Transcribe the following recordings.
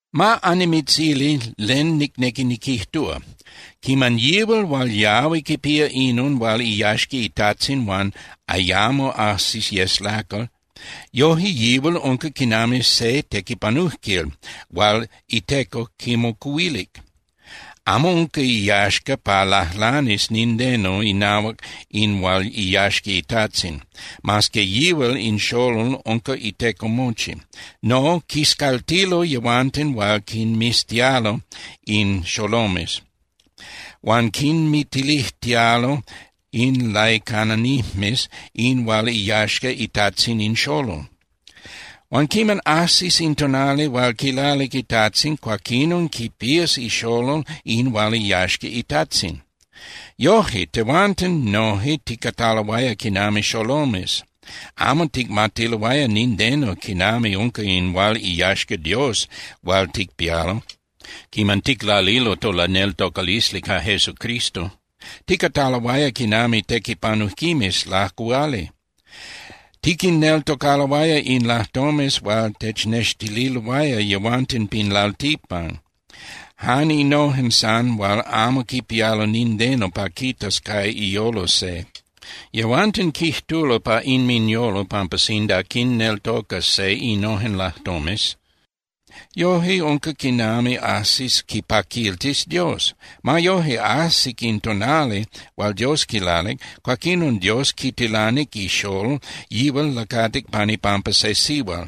Ma annimitzili len nicnequi niquijtúa. Quiman yihual hual yahui quipía inon hual iyaxca itajtzin huan ayamo ajsi yes lacal, yoje yihual unca quinami se tequipanujquil hual iteco quimocuhuilic. Amo unca iyaxca pa lajlanis nindeno inahuac in hual iyaxca itajtzin, mas que yihual in xolol unca iteco mochi. No, quiscaltilo yehuanten hual quinmiztialo in xolomes, huan quinmitilijtialo in laicananijmes in hual iyaxca itajtzin in xolol. Huan quiman ajsis in tonali hual quilalic itajtzin, cuaquinon quipías ixolol in hual iyaxca itajtzin. Yoje tehuanten noje ticataloaya quinami xolomes, amo ticmatiloaya nindeno quinami unca in hual iyaxca Dios hual ticpialo quiman ticlalilo tolaneltocalisli ca Jesucristo. Ticataloaya quinami tequipanujquimes lacuhuali. Tiquinneltocaloaya in lajtomes hual technextililoaya yehuanten pin lalticpan, jan innojen san hual amo quipialo nindeno pa quitas ca iyolo se. Yehuanten quijtulo pa inminyolo pampa sinda quinneltocas se innojen lajtomes, yoje unca quinami ajsis quipaquiltis Dios. Ma yoje, ajsic in tonali hual Dios quilalic, cuaquinon Dios quitilanic ixolol, yihual lacatic pan ipampa se sihual.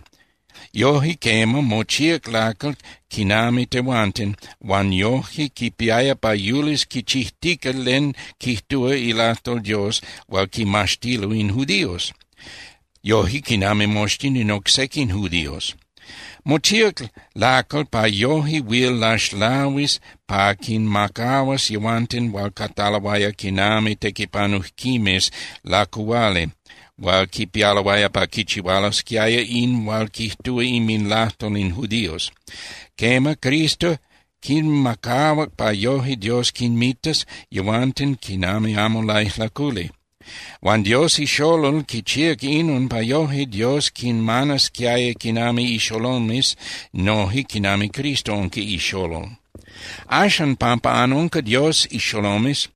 Yoje, quema, mochíac lacal quinami tehuanten, huan yojque quipiaya pa yulis quichijtica len quijtúa ilajtol Dios hual quimaxtilo in judíos, yoje quinami moxtin in oc sequin judíos. Mochíac lacal pa yoje huil laxlahuis pa quinmacahuas yehuanten hual cataloaya quinami tequipanujquimes lacuhuali hual quipialoaya pa quichihualosquiaya in hual quijtúa inminlajtol in judíos. Quema, Cristo quinmacahuac pa yoje Dios quinmitas yehuanten quinami amo laijlaculi. Huan Dios ixolol quichíac inon pa yoje Dios quinmanasquiaya quinami ixolomes noje quinami Cristo unca ixolol. Axan, pampa anunca Dios ixolomes,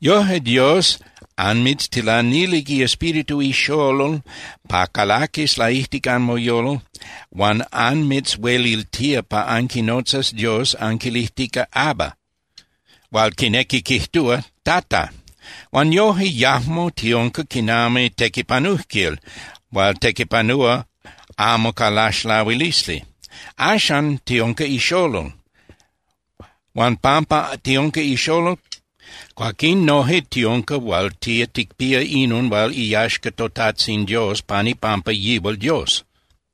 yoje Dios anmitztilanilic iEspíritu ixolol pa calaquis laijtic anmoyolo huan anmitzhueliltía pa anquinotzas Dios anquilijtica: “¡Abba!” hual quinequi quijtúa: “¡Tata!” Huan yoje, yajmo tiunca quinami tequipanujquil hual tequipanúa amo ca laxlahuilisli. Axan tiunca ixolol. Huan pampa tiunca ixolol, cuaquín noje tiunca hual tía ticpía inon hual iyaxca toTajtzin Dios pan ipampa yihual Dios.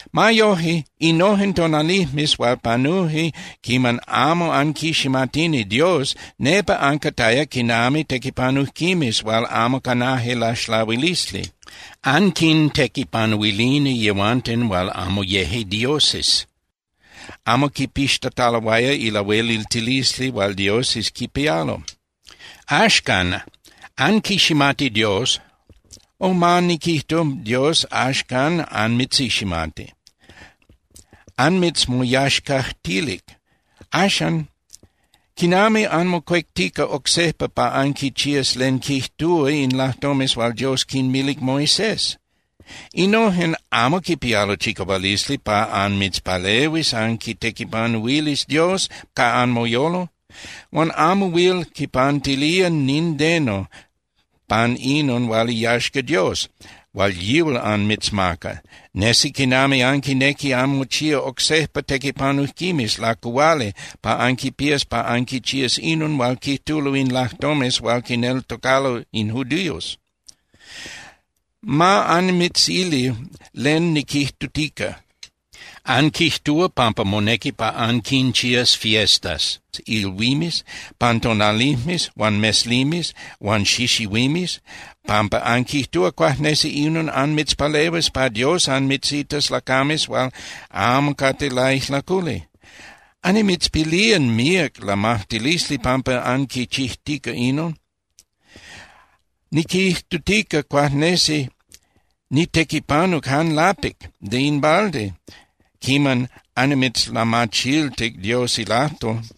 Ma yoje, innojen tonalijmes hual panuje quiman amo anquiximatini Dios, nepa ancataya quinami tequipanujquimes hual amo canaje laxlahuilisli. Anquintequipanuilini yehuanten hual amo yeje dioses, amo quipixtataloaya ilahueliltilisli hual dioses quipialo. Axcan, anquiximati Dios, o ma niquijtu, Dios axcan anmitziximati, anmitzmoyaxcajtilic. Axan ¿quinami anmocuectica oc sejpa pa anquichías len quijtúa in lajtomes hual Dios quinmilic Moisés? Innojen amo quipialo chicahualisli pa anmitzpalehuis anquitequipanuilis Dios ca anmoyolo. Huan amo huil quipantilía nindeno pan inon hual iyaxca Dios hual yihual anmitzmaca. Nesi quinami anquinequi anmochía oc sejpa tequipanujquimes lacuhuali pa anquipías pa anquichías inon hual quijtulo in lajtomes hual quinneltocalo in judíos. Ma annimitzili len niquijtutica: Anquijtúa pampa monequi pa anquinchías fiestas (ilhuimes) pan tonalijmes huan meslimes huan xixihuimes, pampa anquijtúa cuajnesi inon anmitzpalehuis pa Dios anmitzitas lacames hual amo cate laijlaculi. Annimitzpilía míac lamajtilisli pampa anquichijtica inon. Niquijtutica cuajnesi nitequipanuc jan lapic (de in balde) quiman annimitzlamachiltic Dios ilajtol.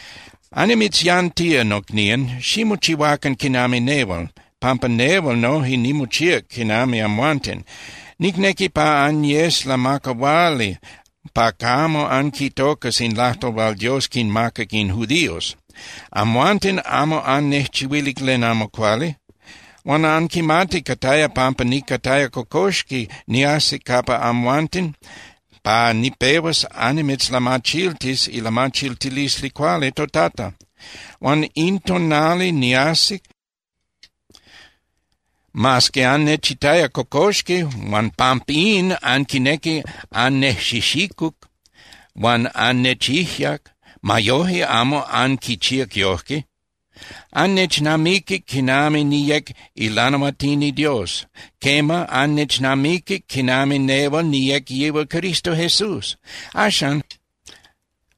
Annimitzyantía, nocnían, ximochihuacan quinami nehual, pampa nehual noje nimochíac quinami amhuanten. Nicnequi pa anyes lamacahuali pa camo anquitocas in lajtol hual Dios quinmacac in judíos. Amhuanten amo annejchihuilic len amo cuali. Huan anquimati cataya pampa nicataya cocoxqui niajsic capa amhuanten pa nipehuas annimitzlamachiltis ilamachiltilisli cuali toTata. Huan in tonali niajsic, mas que annechitaya cocoxqui huan pampín anquinequic annejxijxicuc huan annechijyac, ma yoje amo anquichíac yojque. Annechnamiquic quinami niyec ilanahuatini Dios. Quema, annechnamiquic quinami nehual niyec yihual Cristo Jesús. Axan,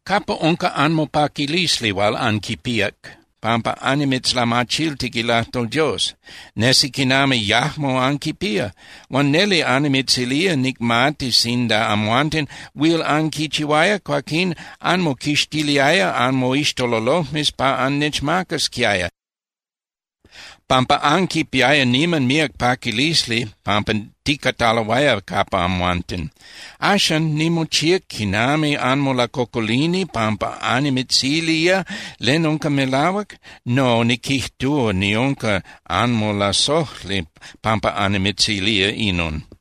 ¿capa unca anmopaquilisli hual anquipíac pampa annimitzlamachiltic ilajtol Dios? Nesi quinami yajmo anquipía. Huan neli annimitzilía, nicmati sinda amhuanten huil anquichihuaya, cuaquín anmoquixtiliaya anmoixtololojmes pa annechmacasquiaya, pampa anquipiaya niman míac paquilisli pampa ticataloaya capa amhuanten. Axan, ¿nimochíac quinami anmolacocolini pampa annimitzilía len unca melahuac? No, niquijtúa niunca anmolasojli pampa annimitzilía inon.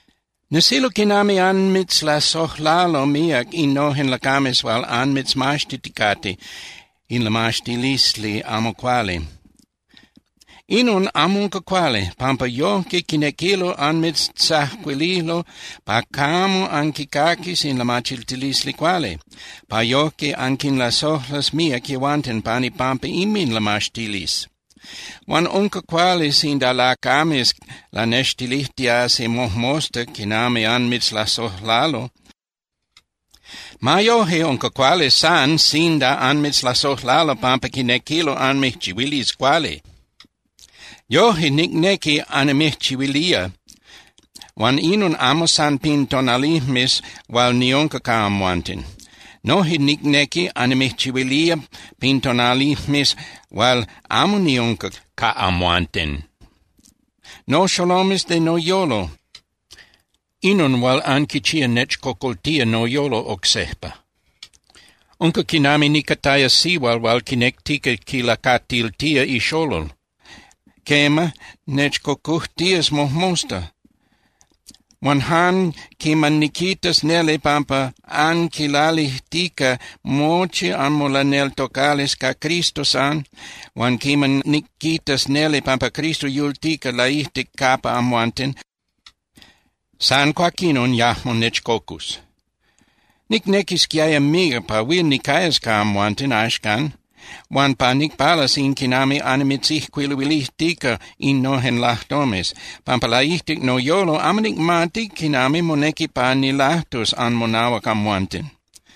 Nesilo quinami anmitzlasojlalo míac innojen lacames huan anmitzmaxtiticate in lamaxtilisli amo cuali. Inon amo unca cuali, pampa yojque quinequilo anmijtzacuililo pa camo anquicaquis in lamachiltilisli cuali, pa yojque anquinlasojlas míac yehuanten pan ipampa inminlamaxtilisli. Huan unca cuali sinda lacames lanextilijtiasi mojmosta quinami anmitzlasojlalo. Ma yoje unca cuali san sinda anmitzlasojlalo pampa quinequilo anmijchihuilis cuali. Yoje nicnequi annimijchihuilía huan inon amo san pin tonalijmes hual niunca ca amhuanten. Noje nicnequi annimijchihuilía pin tonalijmes hual amo niunca ca amhuanten. Noxolomes de noyolo, inon hual anquichía nechcocoltía noyolo oc sejpa. Unca quinami nicataya sihual hual quinectica quilacatiltía ixolol. Quema, nechcocujtías mojmosta. Huan jan quiman niquitas neli pampa anquilalijtica mochi anmolaneltocalisli ca Cristo san, huan quiman niquitas neli pampa Cristo yultica laijtic capa amhuanten, san cuaquinon yajmo nechcocus. ¡Nicnequisquiaya míac pa huil nicayas ca amhuanten axcan huan pa nicpalas in quinami annimitzijcuiluilijtica innojen lajtomes, pampa laijtic noyolo amo nicmati quinami monequi pa nilajtus anmonahuac amhuanten!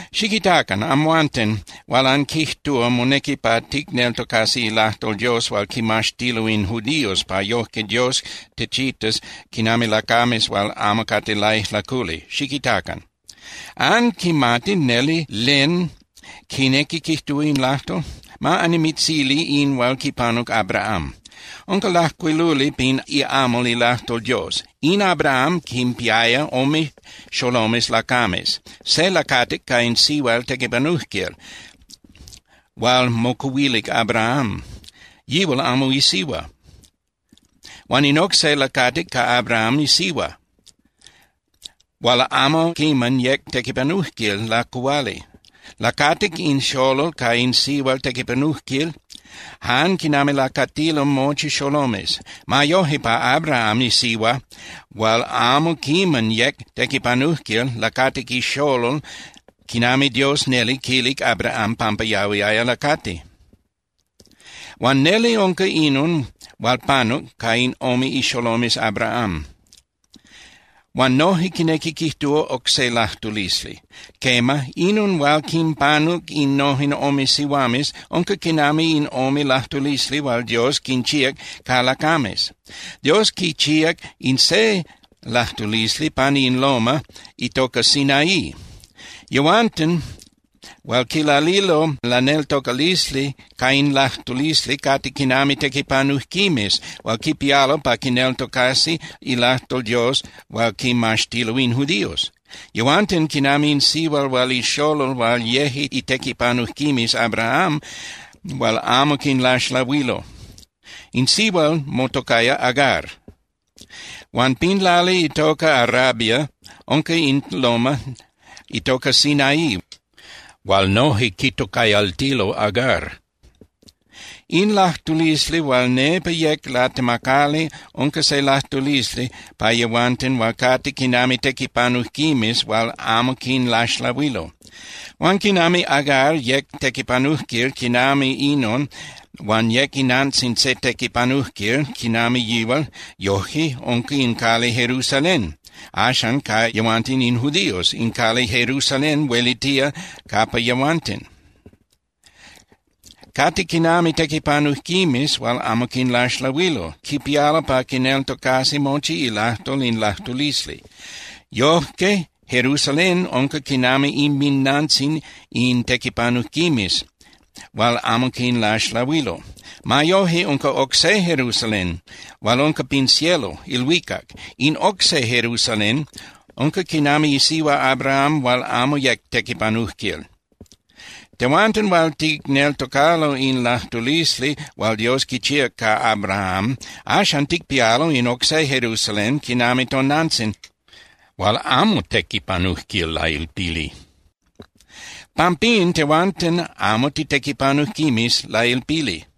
Xiquitacan, amhuanten hual anquijtúa monequi pa ticneltocasi ilajtol Dios hual quimaxtilo in judíos pa yojque Dios techitas quinami lacames hual amo cate laijlaculi, xiquitacan: ¿Anquimati neli len quinequi quijtúa in lajtol? Ma annimitzili in hual quipanuc Abraham. Unca lajcuiluli pin iamal ilajtol Dios. In Abraham quinpiaya ome xolomes lacames: se lacatic ca in sihual tequipanujquil hual mocuhuilic Abraham, yihual amo isihua. Huan in oc se lacatic ca Abraham isihua hual amo quiman yec tequipanujquil lacuhuali. Lacatic in xolol ca in sihual tequipanujquil jan quinami lacatilo mochi xolomes. Ma yoje, pa Abraham isihua hual amo quiman yec tequipanujquil lacatic ixolol quinami Dios neli quilic Abraham pampa yahuiaya lacati. Huan neli unca inon hual panuc ca in ome ixolomes Abraham, huan noje quinequi quijtúa oc se lajtulisli. Quema, inon hual quinpanuc innojen ome sihuames unca quinami in ome lajtulisli hual Dios quinchíac ca lacames. Dios quichíac in se lajtulisli pani in loma (tepel) itoca Sinaí. Yehuanten hual quilalilo laneltocalisli ca in lajtulisli cate quinami tequipanujquimes hual quipialo pa quineltocasi ilajtol Dios hual quimaxtilo in judíos. Yehuanten quinami in sihual huan ixolol hual yeje itequipanujquimes Abraham hual amo quinlaxlahuilo. In sihual motocaya Agar. Huan pin lali itoca Arabia unca in loma (tepel) itoca Sinaí hual noje quitocayaltilo Agar. In lajtulisli hual nepa yec latemacali unca se lajtulisli pa yehuanten hual cate quinami tequipanujquimes hual amo quinlaxlahuilo. Huan quinami Agar yec tequipanujquil quinami inon huan yec inantzin se tequipanujquil quinami yihual, yojque unca in cali Jerusalén axan ca yehuanten in judíos, in cali Jerusalén huelitía capa yehuanten. Cate quinami tequipanujquimes hual amo quinlaxlahuilo. Quipialo pa quineltocasi mochi ilajtol in lajtulisli. Yojque Jerusalén unca quinami inminantzin in tequipanujquimes hual amo quinlaxlahuilo. Ma yoje, unca oc se Jerusalén hual unca pin cielo (ilhuicac). In oc se Jerusalén unca quinami isihua Abraham hual amo yec tequipanujquil. Tehuanten hual ticneltocalo in lajtulisli hual Dios quichíac ca Abraham, axan ticpialo in oc se Jerusalén quinami tonantzin hual amo tequipanujquil lailpili. Pampín tehuanten amo titequipanujquimes lailpili.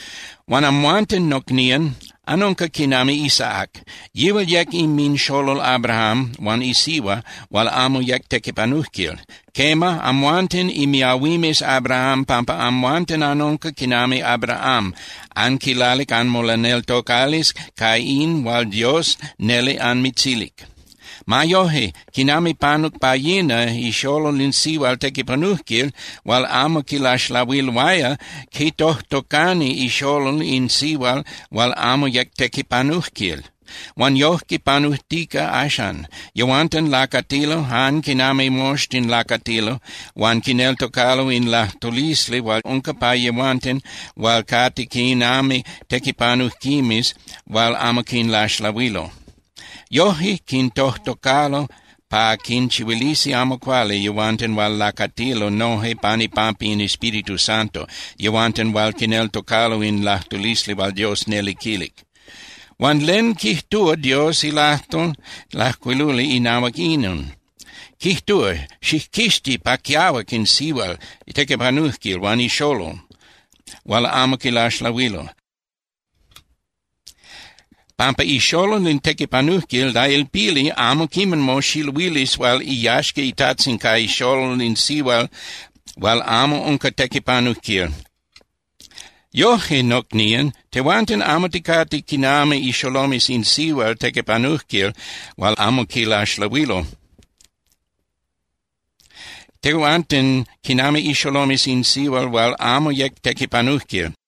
Huan amhuanten, nocnían, anunca quinami Isaac, yihual yec inminxolol Abraham huan isihua hual amo yec tequipanujquil. Quema, amhuanten imiahuimes Abraham pampa amhuanten anunca quinami Abraham, anquilalic anmolaneltocalisli ca in hual Dios neli anmitzilic. Ma yoje, quinami panuc pa yina, ixolol in sihual tequipanujquil hual amo quilaxlahuiloaya quitojtocani ixolol in sihual hual amo yec tequipanujquil. Huan yojque panujtica axcan. Yehuanten lacatilo jan quinami moxtin lacatilo huan quineltocalo in lajtulisli hual unca pa yehuanten hual cate quinami tequipanujquimes hual amo quinlaxlahuilo. Yoje quintojtocalo pa quinchihuilisi amo cuali yehuanten hual lacatilo noje pan ipampa in Espíritu Santo, yehuanten hual quineltocalo in lajtulisli hual Dios neli quilic. Huan ¿len quijtúa Dios ilajtol lajcuiluli inahuac inon? Quijtúa: “Xijquixti pa quiahuac in sihual tequipanujquil huan ixolol hual amo quilaxlahuilo, pampa ixolol in tequipanujquil lailpili amo quiman moxiluilis hual iyaxca itajtzin ca ixolol in sihual hual amo unca tequipanujquil.” Yoje, nocnían, tehuanten amo ticate quinami ixolomes in sihual tequipanujquil hual amo quilaxlahuilo. Tehuanten quinami ixolomes in sihual hual amo yec tequipanujquil.